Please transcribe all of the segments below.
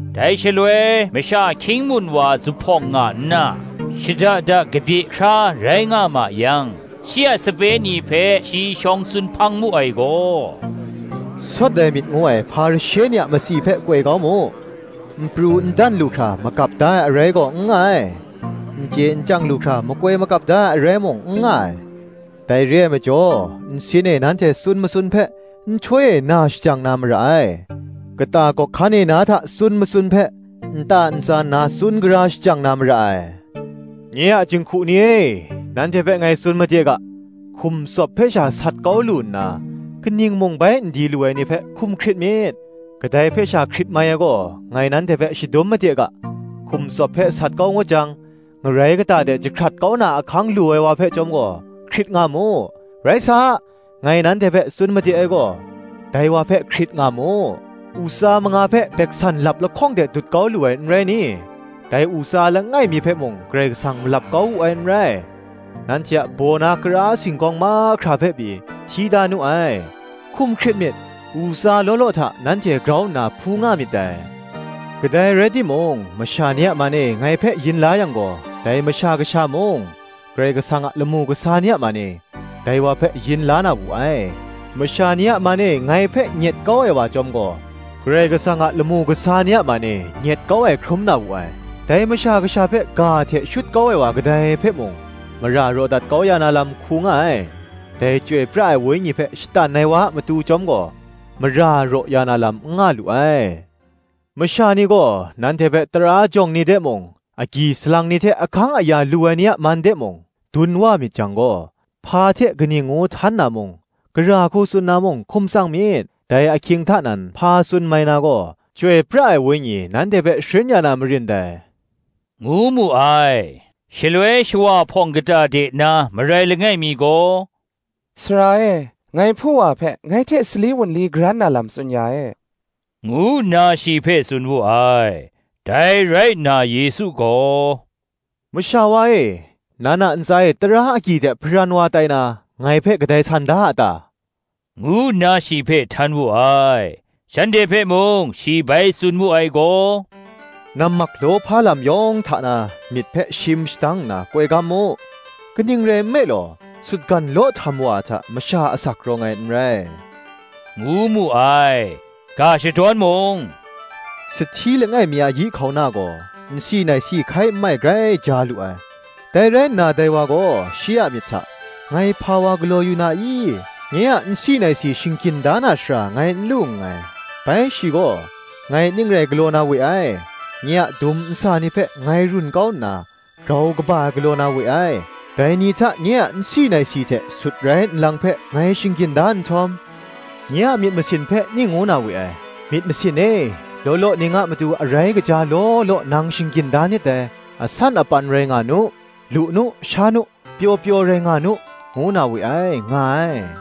Dai shaloi masha hkying mun wa zuphpawng nga nna, shada da kabye hkra rai nga ma yang, shi a sape ni hpe shi shawng tsun hpang mu ai gaw, “Sawt ai myit ngu ai, Hparishe ni a matsi hpe koi kau mu. N pru n dan lu hkra magap da ai arai gaw n nga ai; n chye n chyang lu hkra makoi magap da ai arai mung, n nga ai. Dai re ai majaw, nsin e nanhte tsun matsun hpe, nhtoi e na shajang na mara ai; kata gawk hkan e na hta tsun matsun hpe, nta ntsa nna tsun gara shajang na mara ai. Nye a jinghku ni e, nanhte hpe ngai tsun made ga, Hkum tsawp hpe sha sat kau lu nna, kaning mung bai n di lu ai ni hpe, hkum hkrit myit. Kadai hpe sha hkrit mai ai gaw, ngai nanhte hpe shadum made ga; Hkum tsawp hpe sat kau ngut jang, ngarai kata de jahkrat kau na ahkang lu ai wa hpe chyawm gaw, hkrit nga mu: rai sa, ngai nanhte hpe tsun made ai gaw, Dai wa hpe hkrit nga mu. U tsa manga hpe gumhpraw lap lahkawng hte dut kau lu ai, n rai ni? dai u tsa langai mi hpe mung Karai Kasang malap kau wu ai n rai. Nanhte a baw na kara singgawng mahkra hpe pyi, hti da nu ai. Hkum hkrit myit: u tsa law law hta nanhte grau nna hpu nga myit dai. Kadai rai timung masha ni a man e ngai hpe yin la yang gaw, dai Masha Kasha mung, Karai Kasang a lamu kasa ni a man e, dai wa hpe yin la na wu ai: masha ni a man e ngai hpe nyet kau ai wa chyawm gaw, Karai Kasang a lamu kasa ni a man e nyet kau ai hkrum na wu ai. Dai Masha Kasha hpe ga hte shut kau ai wa kadai hpe mung, mara raw dat kau ya na lam hku nga ai: dai Chyoi pra ai Wenyi hpe shatan ai wa a matu chyawm gaw, mara raw ya na lam n nga lu ai. masha ni gaw nanhte hpe tara jawng ni de mung, agyi salang ni hte ahkang aya lu ai ni a man de mung, dun wa myit jang gaw, hpa hte kaning ngu htan na mung, gara hku tsun na mung, hkum tsang myit: dai ahkying hta nan hpa tsun mai na gaw, Chyoi pra ai Wenyi nanhte hpe sharin ya na marin dai,” ngu mu ai. Shaloi shawa hpawng kata de na marai langai mi gaw, “Sara e, ngai hpu wa hpe ngai hte sali wunli karan na lam tsun ya e,” ngu nna shi hpe tsun wu ai. Dai rai nna Yesu gaw, “Masha wa e, nan a ntsa e tara agyi hte hparan wa tai na, ngai hpe kadai san da a ta?” ngu nna shi hpe htan wu ai. Shanhte hpe mung shi bai tsun mu ai gaw, Nammak lawhpa lam yawng hta na myit hpe shim shadang nna koi gam mu: kaning rai nme law, sutgan law htam wa ai hta, masha asak rawng ai n rai,” ngu mu ai. Ga shadawn mung, “Sahti langai mi a yi hkauna gaw nsi naisi hkai nmai grai ja lu ai. Dai rai nna dai wa gaw shi a myit hta, ‘Ngai hpa wa galaw yu na i? nye a nsi naisi shinggyin da na shara ngai n lu nngai: bai shi gaw, Ngai ning rai galaw na we ai: nye a dum nsa ni hpe ngai run kau nna grau kaba ai galaw na we ai; dai ni hta nye a nsi naisi hte sutrai nlang hpe ngai shinggyin da nhtawm, nye a myit masin hpe ning ngu na we ai, ‘Myit masin e, law law ning a matu arai kaja law law nang shinggyin da nit dai: asan apan rai nga nu, lu nu, sha nu, pyaw pyaw rai nga nu’ ngu na we ai,” nga ai.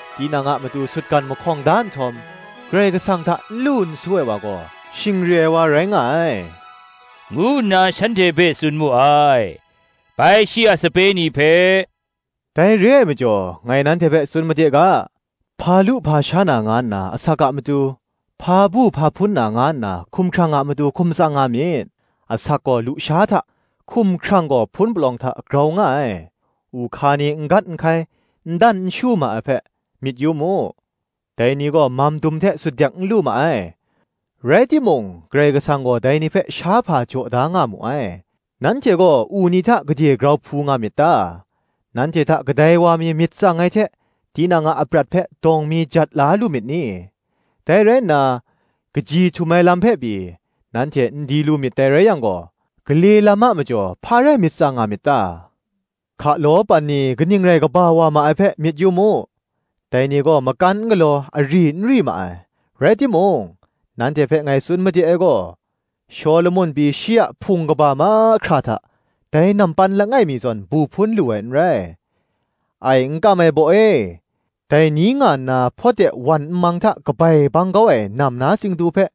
Tinang a matu sutgan mahkawng da nhtawm, Karai Kasang hta n lu n su ai wa gaw, shing re ai wa rai nga ai, ngu nna shanhte hpe tsun mu ai. Bai shi a sape ni hpe, “Dai re ai majaw ngai nanhte hpe tsun made ga, ‘Hpa lu hpa sha na, nga nna asak a matu, hpa bu hpa hpun na, nga nna a matu hkum tsang nga myit: asak gaw lusha hta, gaw hpun palawng hta, grau nga ai. U hka ni n gat n hkai, n dan n shu ma ai hpe, myit yu mu: dai ni gaw mamdum hte sutdek n lu ma ai; rai timung Karai Kasang gaw dai ni hpe shahpa jaw da nga mu ai: nanhte gaw u ni hta gade grau hpu myit ta? Nanhte hta kadai wa mi myit tsang ai hte, tinang a aprat hpe dawng mi jat la lu myit ni? Dai rai nna, kaji htum ai lam hpe pyi, nanhte n di lu myit dai rai yang gaw, gale lam a majaw hpa rai myit tsang nga myit ta? Hkalaw pan ni kaning rai kaba wa ma ai hpe, myit yu mu: dai ni gaw makan n galaw, ari n ri ma ai: rai timung, nanhte hpe ngai tsun made ai gaw, Shawlumon pyi shi a hpung kaba mahkra hta, dai nampan langai mi zawn bu hpun lu ai n rai. Ai n kam ai baw e, dai ni nga nna hpawt de wan mang hta kabai bang kau ai nam na tsingdu hpe,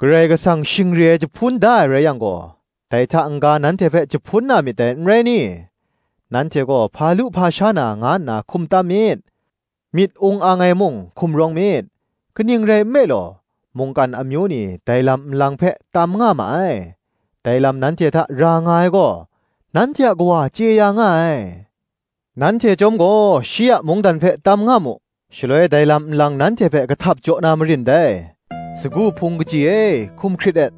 Karai Kasang shing re ai jahpun da ai rai yang gaw, dai hta n ga nanhte hpe jahpun na myit dai, n rai ni? Nanhte gaw, hpa lu hpa sha na, nga nna hkum tam myit: myit ung ang ai mung hkum rawng myit: kaning rai nme law, mungkan amyu ni dai lam nlang hpe tam nga ma ai: dai lam nanhte hta ra nga ai gaw, nanhte a Kawa chye ya nga ai. Nanhte chyawm gaw shi a mungdan hpe tam nga mu, shaloi dai lam nlang nanhte hpe kahtap jaw na marin dai. Sagu hpung kaji e, hkum hkrit et;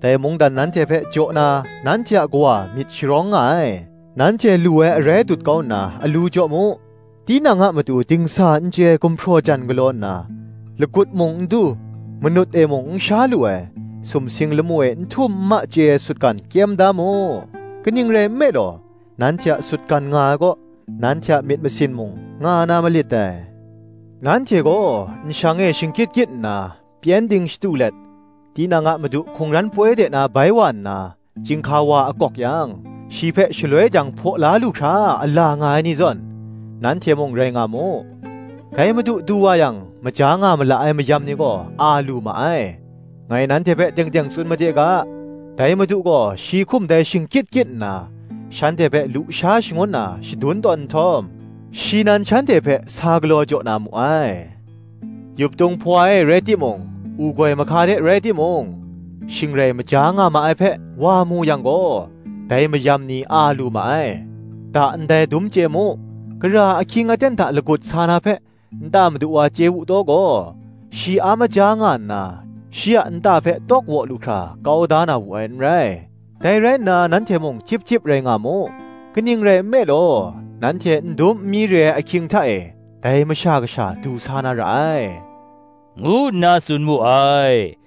dai mungdan nanhte hpe jaw na, nanhte a Kawa myit sharawng nga ai. Nanhte lu ai arai dut kau nna alu jaw mu; tinang a matu dingsa n chye ai gumhpraw jan galaw nna, lagut mung n du, manut e mung n sha lu ai, sumsing lamu e n htum n ma chye ai sutgan, kyem da mu. Kaning rai nme law, nanhte a sutgan nga ai kaw, nanhte a myit masin mung nga na malit dai. “Nanhte gaw nshang e shingkyit kyit nna, pyengdin shatu let, tinang a madu hkungran poi de na bai wa nna, chyinghka wa akawk yang, shi hpe shaloi jang hpaw la lu hkra ala nga ai ni zawn, nanhte mung rai nga mu. Dai madu du wa yang, maja nga ma la ai mayam ni gaw, a lu ma ai: ngai nanhte hpe teng teng tsun made ga, dai madu gaw shi hkum dai shingkyit kyit nna, shanhte hpe lu sha shangun na shadun tawn nhtawm, shi nan shanhte hpe sa galaw jaw na mu ai. Yuptung hpawa e rai timung, u goi mahka de rai timung, shing rai maja nga ma ai hpe, wa mu yang gaw, dai mayam ni a lu ma ai. Da ndai dum chye mu: gara ahkying aten hta lagut sa na hpe, nta madu wa chye wu taw gaw, shi a maja nga nna, shi a nta hpe tawk waw lu hkra, kau da na wu ai n rai. Dai rai nna nanhte mung chyip chyip rai nga mu: kaning rai nme law, nanhte n dum n mi re ai ahkying hta e, dai Masha Kasha du sa na ra ai,” ngu nna tsun mu ai.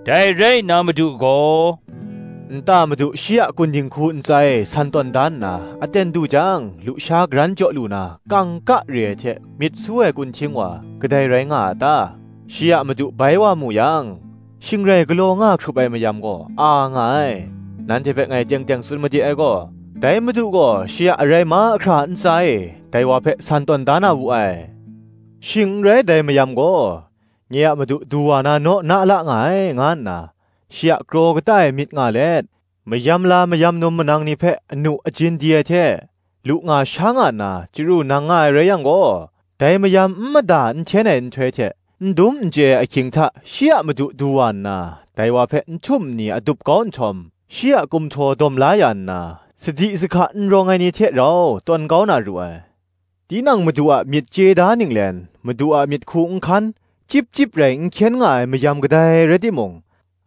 Dai rai nna Madu gaw, “Nta madu shi a kun dinghku ntsa e san tawn da nna, aten du jang lusha karan jaw lu na kangka re ai hte myit su ai kunhting wa, kadai rai nga a ta? Shi a madu bai wa mu yang, shing rai galaw nga hkrup ai mayam gaw, a nga ai.” Nanhte hpe ngai teng teng tsun made ai gaw, “Dai madu gaw shi a arai mahkra a ntsa e, dai wa hpe san tawn da na wu ai. Shing n rai, dai mayam gaw, “Nye a madu du wa na naw na la nga ai, nga nna shi a kraw kata e myit nga let, mayam la, mayam num manang ni hpe anu ajin di ai hte, lu nga, sha nga nna chyaru nang nga ai rai yang gaw, dai mayam n mada n hten ai nhtoi hte, n dum n chye ai ahkying hta, shi a madu du wa nna, dai wa hpe nhtum nni adup kau nhtawm, shi a kumhtaw dawm la ya nna, sadi sahka n rawng ai ni hte rau tawn kau na ru ai. Tinang madu a myit chye da ninglen, madu a myit hku n hkan, chyip chyip rai n hkyen nga ai mayam kadai rai timung,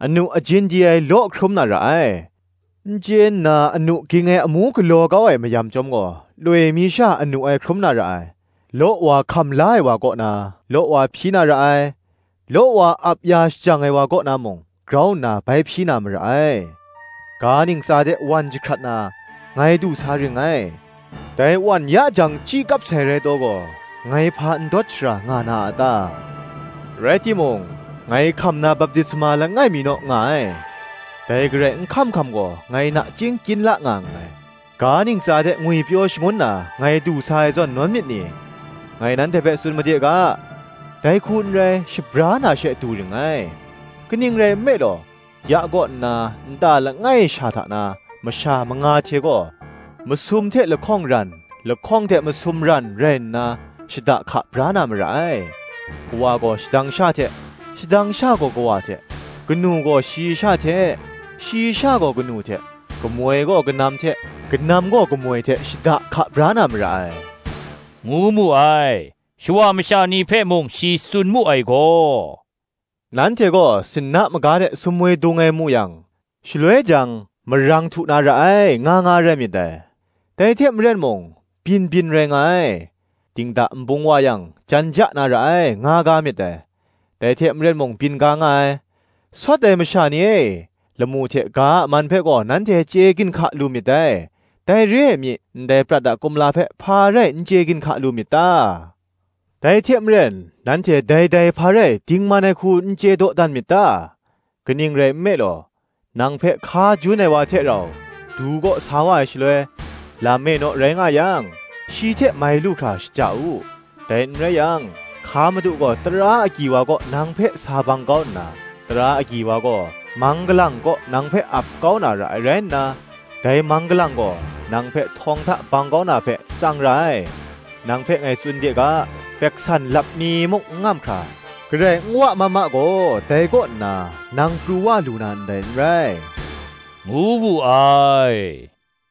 anu ajin di ai, law hkrum na ra ai. n chye nna anu ging ai amu galaw kau ai mayam chyawm gaw, loi mi sha anu ai hkrum na ra ai. Law wa hkam la ai wa kaw na, law wa hpyi na ra ai; law wa ap ya shajang ai wa kaw na mung, grau nna bai hpyi na mara ai. “Ga ntsa de wan jahkrat na, ngai du sa ring ngai; dai wan ya jang chyi kap sai rai taw gaw, ngai hpa ndawt shara nga na a ta? Rai timung, ngai hkam na baptisma langai mi naw nga ai; dai garai n hkam hkam gaw, ngai nachying kyin la nga nngai. Ga ntsa de ngwipyaw shangun na, ngai du sa ai zawn nawn myit ni? ngai nanhte hpe tsun made ga, Dai hku n rai, shabra na she, du ring ngai. Kaning rai nme law, ya kaw nna nta langai sha hta na masha manga hte gaw, masum hte lahkawng ran, lahkawng hte masum ran, rai nna shada hka bra na mara ai. Kawa gaw shadang sha hte, shadang sha gaw kawa hte; kanu gaw shayi sha hte, shayi sha gaw kanu hte; kamoi gaw kanam hte, kanam gaw kamoi hte shada hka bra na mara ai,” ngu mu ai. Shawa masha ni hpe mung shi tsun mu ai gaw, “Nanhte gaw sinna maga de sumwi dung ai mu yang, shaloi jang, ‘Marang htu na ra ai,’ nga nga rai myit dai: dai hte maren mung, byin byin rai nga ai. Dingda nbung wa yang, ‘Jan ja na ra ai,’ nga ga myit dai; dai hte maren mung byin ga nga ai. Sawt ai masha ni e, lamu hte ga a man hpe gaw nanhte chye ginhka lu myit dai: dai re ai mi, ndai prat a kumla hpe, hpa rai n chye ginhka lu myit ta? Dai hte maren nanhte dai dai hpa rai dingman ai hku n chye dawdan myit ta? Kaning rai nme law, nang hpe hka jun ai wa hte rau, du kaw sa wa ai shaloi, lam e naw rai nga yang, shi hte mai lu hkra shaja u: dai n rai yang, hka madu gaw tara agyi wa kaw nang hpe sa bang kau nna, tara agyi wa gaw mang galang kaw nang hpe ap kau na ra ai rai nna, dai mang galang gaw nang hpe htawng hta bang kau na hpe tsang ra ai. Nang hpe ngai tsun de ga, gumhpraw lap mi muk n ngam hkra, garai n wa ma ma gaw, dai kaw nna nang pru wa lu na ndai n rai,” ngu wu ai.